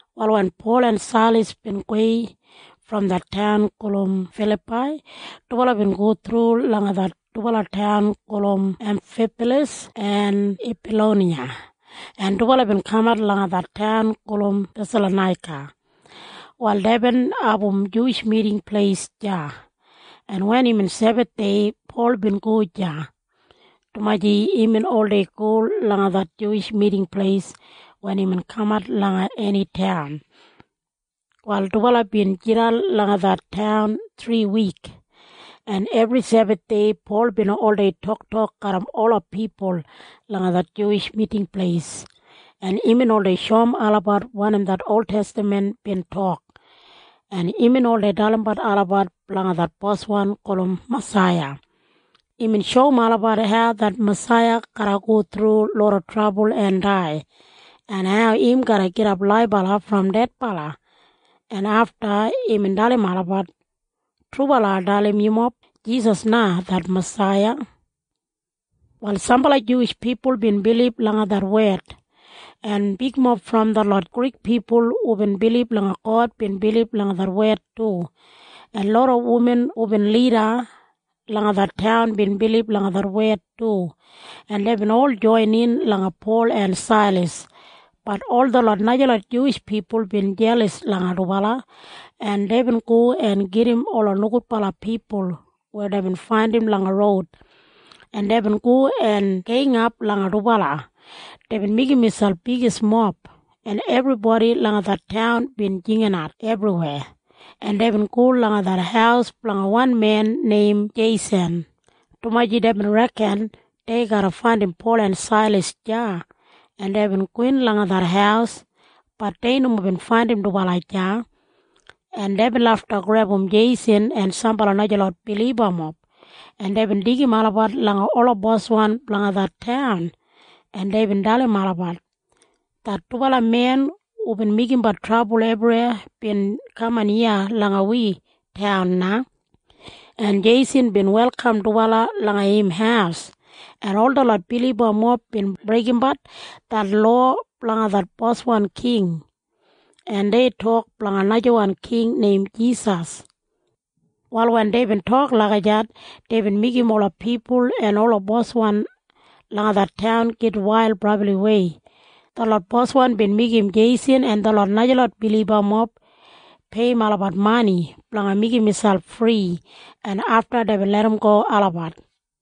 Wal wen Pol en Sailas bin gowei brom det taun gulum Filapai, dubala bin go thru langa det dubala taun gulum Emfipalas en Epaloniya, en dubala bin kamat langa det taun gulum Thesalonaika. Wal deibin abum Juwish Miting Pleis deya, en wen imbin Sebathdei, Pol bin go deya, dumaji imbin oldei go langa det Juwish Miting Pleis wen imbin kamat langa eni taun. Wal dubala bin jidan langa det taun thriwik, en ebri Sebathdei Pol bin oldei toktok garram ola pipul langa det Juwish Miting Pleis, en imbin oldei shoum olabat wanim det oltestaman im tok, en imbin oldei dalimbat olabat blanga det Boswan gulum Masaiya. Imbin shoum olabat hau det Masaiya garra go thru loda trabul en dai, en hau im garra gidap laibala brom dedbala, en afta imbin dalim olabat, “Trubala ai dalim yumob. Jisas na det Masaiya.” Wal sambala Juwish pipul bin bilib langa det wed, en bigmob brom detlot Grik pipul hubin bilib langa God bin bilib langa det wed du, en loda wuman hubin lida langa det taun bin bilib langa det wed du, en deibin ol joinin langa Pol en Sailas. Bat ol detlot najalot Juwish pipul bin jelas langa dubala, en deibin go en gedim ola nogudbala pipul weya deibin faindim langa roud, en deibin go en geingap langa dubala. Deibin meigim miselp bigismob, en ebribodi langa det taun bin jinginat ebriweya, en deibin go langa det haus blanga wan men neim Jeisan, dumaji deibin reken dei garra faindim Pol en Sailas deya, en deibin gowin langa det haus. Bat dei nomo bin faindim dubala deya, en deibin lafta grebum Jeisan en sambala najalot bilibamob, en deibin deigim olabat langa ola boswan blanga det taun, en deibin dalim olabat, “Det dubala men hubin meigimbat trabul ebriweya bin kaman iya langa wi taun na, en Jeisan bin welkam dubala langa im haus, en ol detlot bilibamob bin breigimbat det lowa blanga det boswan king, en dei tok blanga najawan king neim Jisas.” Wal wen deibin tok lagijat, deibin meigim ola pipul en ola boswan langa det taun gitwail brabliwei. Detlot boswan bin meigim Jeisan en detlot najalot bilibamob peiyim olabat mani blanga meigim miselp fri, en afta deibin larramgo olabat.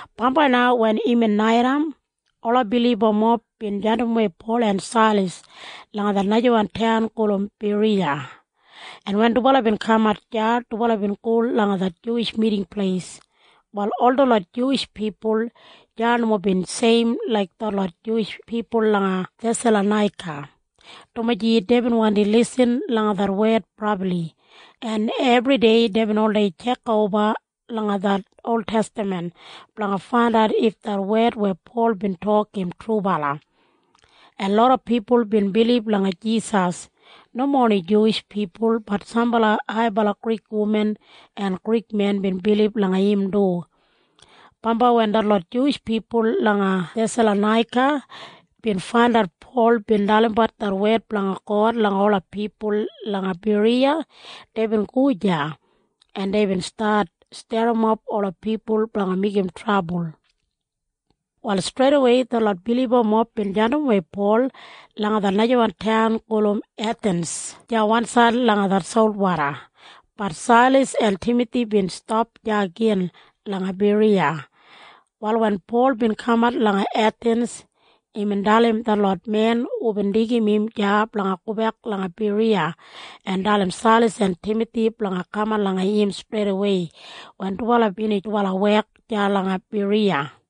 Bambai na wen imbin naitaim, ola bilibamob bin jandimwei Pol en Sailas langa det najawan taun gulum Beriya, en wen dubala bin kamat deya, dubala bin go langa det Juwish Miting Pleis. Wal ol detlot Juwish pipul deya nomo bin seim laik detlot Juwish pipul langa Thesalonaika, dumaji deibin wandi lisin langa det wed brabli, en ebridei deibin oldei tjekoba langa det oltestaman blanga faindat if det wed weya Pol bin tok im trubala, en loda pipul bin bilib langa Jisas. Nomo oni Juwish pipul, bat sambala haibala Grik wuman en Grik men bin bilib langa im du. Bambai wen detlot Juwish pipul langa Thesalonaika bin faindat Pol bin dalimbat det wed blanga God langa ola pipul langa Beriya, deibin go deya, en deibin stat sterrimap ola pipul blanga meigim trabul. Wal streidawei detlot bilibamob bin jandimwei Pol langa det najawan taun gulum Ethins deya wansaid langa det solwoda. Bat Sailas en Timathi bin stap deya gin langa Beriya. Wal wen Pol bin kamat langa Ethins, imbin dalim detlot men hubin deigim im deya blanga gobek langa Beriya en dalim Sailas en Timathi blanga kaman langa im streidawei wen dubala binij dubala wek deya langa Beriya.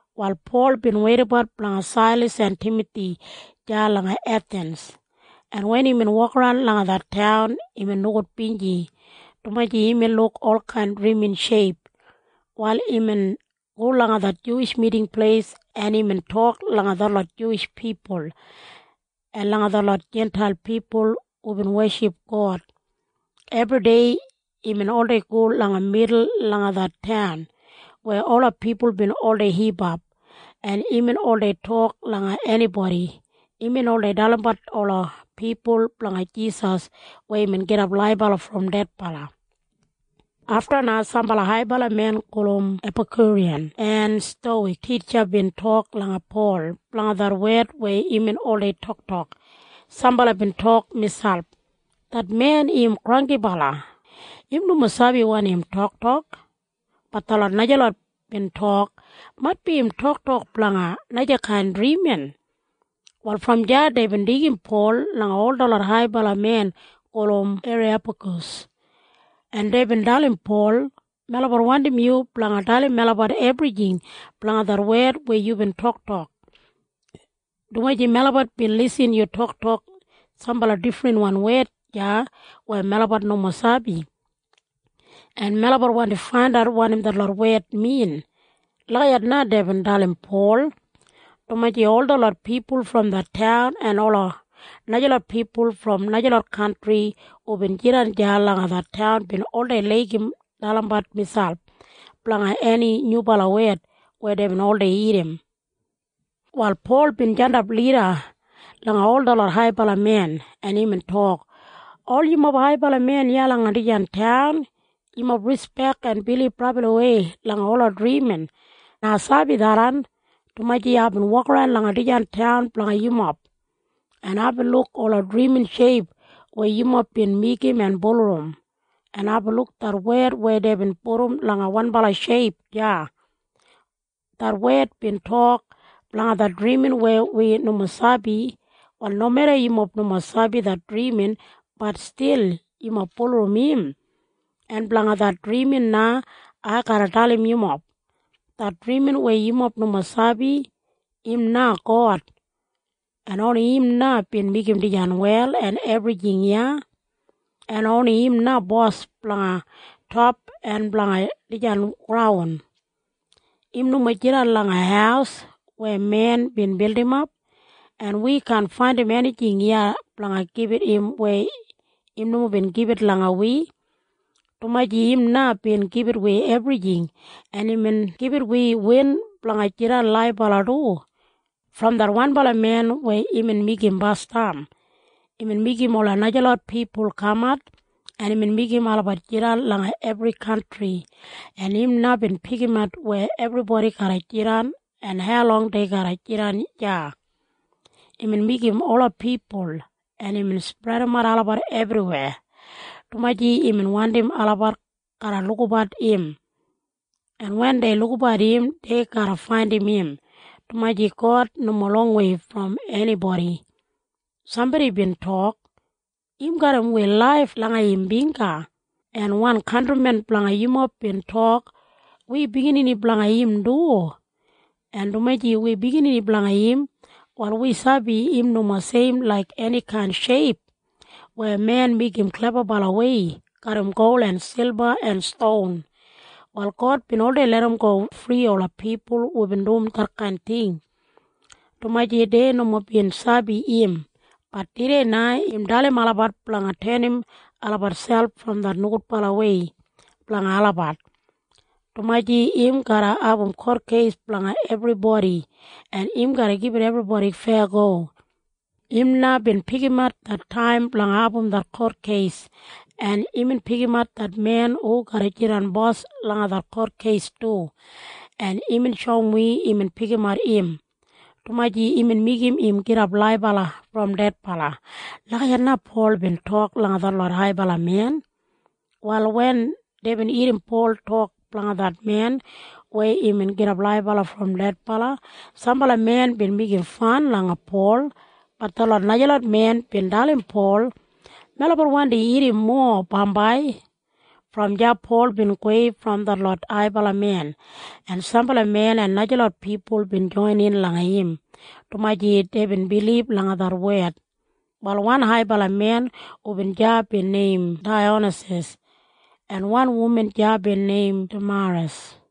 Wal Pol bin weidabat blanga Sailas en Timathi deya langa Ethins, en wen imbin wokaran langa det taun, imbin nogudbinji, dumaji imbin luk olkain drimin sheip. Wal imbin go langa det Juwish Miting Pleis, en imbin tok langa detlot Juwish pipul en langa detlot Jintail pipul hubin weship God. Ebridei imbin oldei go langa midul langa det taun weya ola pipul bin oldei hipap, en imbin oldei tok langa enibodi. Imbin oldei dalimbat ola pipul blanga Jisas weya imbin gidap laibala brom dedbala. Afta na sambala haibala men gulum Epakyuriyan en Stowik titja bin tok langa Pol blanga det wed weya imbin oldei toktokbat. Sambala bin tok miselp, “Det men im granggibala. Im nomo sabi wanim im toktokbat!” Bat detlot najalot bin tok, “Maitbi im toktok blanga najakain drimin.” Wal brom deya deibin deigim Pol langa ol detlot haibala men gulum Eriyapagas, en deibin dalim Pol. “Melabat wandim yu blanga dalim melabat ebrijing blanga det wed weya yubin toktok, dumaji melabat bin lisin yu toktok sambala difrinwan wed deya weya melabat nomo sabi, en melabat wandi faindat wanim detlot wed min.” Lagijat na deibin dalim Pol, dumaji ol detlot pipul brom det taun en ola najalot pipul brom najalot kantri hubin jidan deya langa det taun bin oldei laigim dalimbat miselp blanga eni nyubala wed weya deibin oldei irrim. Wal Pol bin jandap lida langa ol detlot haibala men, en imbin tok, “Ol yumob haibala men iya langa dijan taun, yumob rispek en bilib brabliwei langa ola drimin. Ai sabi tharran, dumaji aibin wokaran langa dijan taun blanga yumob, en aibin luk ola drimin sheip weya yumob bin meigim en bulurrum, en aibin luk det wed weya deibin pudum langa wanbala sheip deya. Det wed bin tok, ‘Blanga det drimin weya wi nomo sabi.’ Wal nomeda yumob nomo sabi det drimin, bat stil yumob bulurrum im, en blanga det drimin na ai garra dalim yumob. Det drimin weya yumob nomo sabi, im na God, en oni im na bin meigim dijan wel en ebrijing iya, en oni im na Bos blanga top en blanga dijan graun. Im nomo jidan langa haus weya men bin bildimap, en wi kaan faindim enijing iya blanga gibit im weya im nomo bin gibit langa wi, dumaji im na bin gibit wi ebrijing, en imbin gibit wi win blanga jidan laibala du. Brom det wanbala men weya imbin meigim basdam, imbin meigim ola najalot pipul kamat, en imbin meigim olabat jidan langa ebri kantri, en im na bin pikimat weya ebribodi garra jidan en haulong dei garra jidan deya. Imbin meigim ola pipul, en imbin spredimat olabat ebriweya, dumaji imbin wandim olabat garra lukabat im, en wen dei lukabat im, dei garra faindim im, dumaji God nomo longwei brom enibodi. Sambodi bin tok, ‘Im garram wi laif langa im bingga.’ En wan kantrimen blanga yumob bin tok, ‘Wi biginini blanga im du.’ En dumaji wi biginini blanga im, wal wi sabi im nomo seim laik enikain sheip weya men meigim klebabalawei garram gol en silba en ston. “Wal God bin libum ol detkain nogudbala ting weya pipul bin oldei dumbat, dumaji dei nomo bin sabi im. Bat tudei na im dalim olabat blanga tenim olabat selp brom det nogudbalawei blanga olabat, dumaji im garra abum kotkeis blanga ebribodi, en im garra gibit ebribodi feyago. Im na bin pikimat det taim blanga abum det kotkeis, en imbin pikimat det men hu garra jidan bos langa det kotkeis du, en imbin shoum wi imbin pikimat im, dumaji imbin meigim im gidap laibala brom dedbala.” Lagijat na Pol bin tok langa detlot haibala men. Wal wen deibin irrim Pol tok blanga det men weya imbin gidap laibala brom dedbala, sambala men bin meigimbat fan langa Pol. Bat detlot najalot men bin dalim Pol, “Melabat wandi irrim mowa bambai.” Brom deya Pol bin gowei brom detlot haibala men, en sambala men en najalot pipul bin joinin langa im, dumaji deibin bilib langa det wed. Wal wan haibala men hubin deya bin neim Daiyonasas, en wan wuman deya bin neim Damaras.